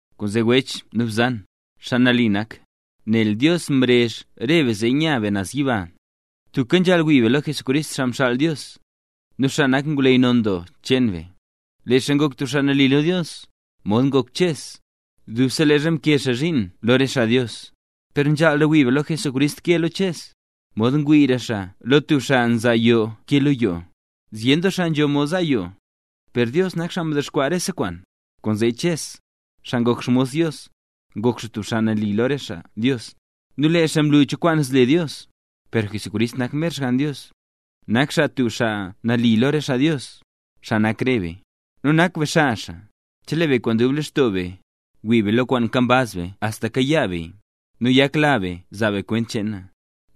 Kwaanzee wech nu bzan, xaa nambey nak, nel Dios mrezh re be zee nya be naz yiba, tubka nzhaal wii be lo Jesucrist, xaa mxaal Dios, nu xaa nak ngwleyy non doo cheen be. Lee xaa ngok tub xaa nali lo Dios, mod ngok Ches, dubse leezha mkee xaa zhiin lo re xaa Dios. Per nzhaalra wii xaa lo Jesús ke lo Ches, mod ngwiira xaa lo tub xaa nza yoo ke lo yoo. Zyen doo xaa nzho mod za yoo, per Dios nak xaa ndexkwaa rese kwaan. Kwaanzee Ches, xaa ngok xmos Dios, ngok xaa tub xaa nali lo re xaa Dios, nu lee xaa mlu cho kwaan zle Dios. Per Jesucrist, nak mer Xgann Dios, nak xaa tub xaa nali lo re xaa Dios, xaa nak re be. Nu nak be xaa xaa, chelee be kwaan dub lextoo be, ngwii be lo kwaan nkambaz be axta kayaa beya, nu nyakla be zaa be kwent cheena.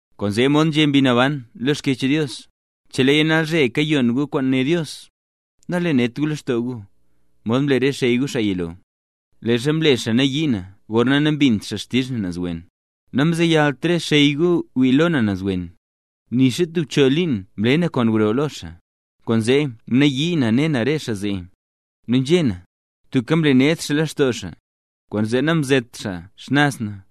Kwaanzee mod nzhé Mbi Naban lo Xkyech Dios: Cheleeya nalzhe kayon gu kwaan né Dios, nalenedt gu lextoo gu, mod mle re xey gu xaa yilo, leezha mle xaa nayii na gorna nambint xaa xtizh na naz wen. Namzeyalt re xey gu wii lo na naz wen, nixa tub choo liin mle na kwaan gro lo xaa. Kwaanzee mnayii na ne na re xaa zee, nu nzhé na: “Tubka mlened xaa lextoo xaa, kwaanzee namzet xaa xnaz na”.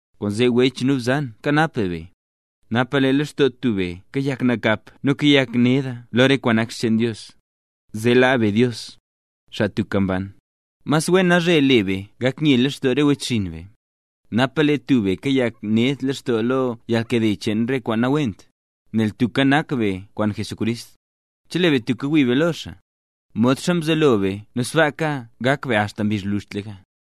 Kwaanzee wech nu bzan kanap be be, napa lee lextoo tub be kayak nakap nu kayak neda lo re kwaan nak xcheen Dios, zeeka laa be Dios, xaa tubka mban. Mas wen nalzhe le be gak nye lextoo re wechxinn be, napa lee tub be kayak ned lextoo lo yalnkade cheen re kwaan nawent. Nel tubka nak be kwaan Jesucrist, chelee be tubka ngwii be lo xaa, modxa mzelo be nu sbaaka gak be axta mbizh gwluzhtlaka.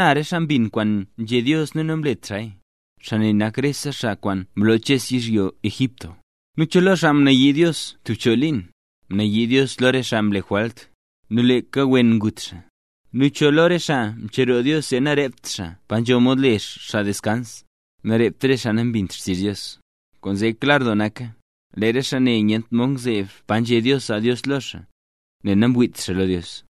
¿Xana re xaa mbin kwaan nzhé Dios nu namlet xaaya? Xaa ne nak rese xaa kwaan mloo Ches yizhyo Egipto. ¿Nu cho lo xaa mnayii Dios tub choo liin? Mnayii Dios lo re xaa mle jwalt, nu leeka wen ngut xaa. ¿Nu cho lo re xaa mcheroo Dios zee narept xaa pa nzho mod le xaa deskans? Namrept re xaa nambint xtizh Dios. Kwaanzee klar doo naka, lee re xaa ne nyent mod ngzeeb pa nzhé Dios zaa Dios lo xaa, nel namwiit xaa lo Dios.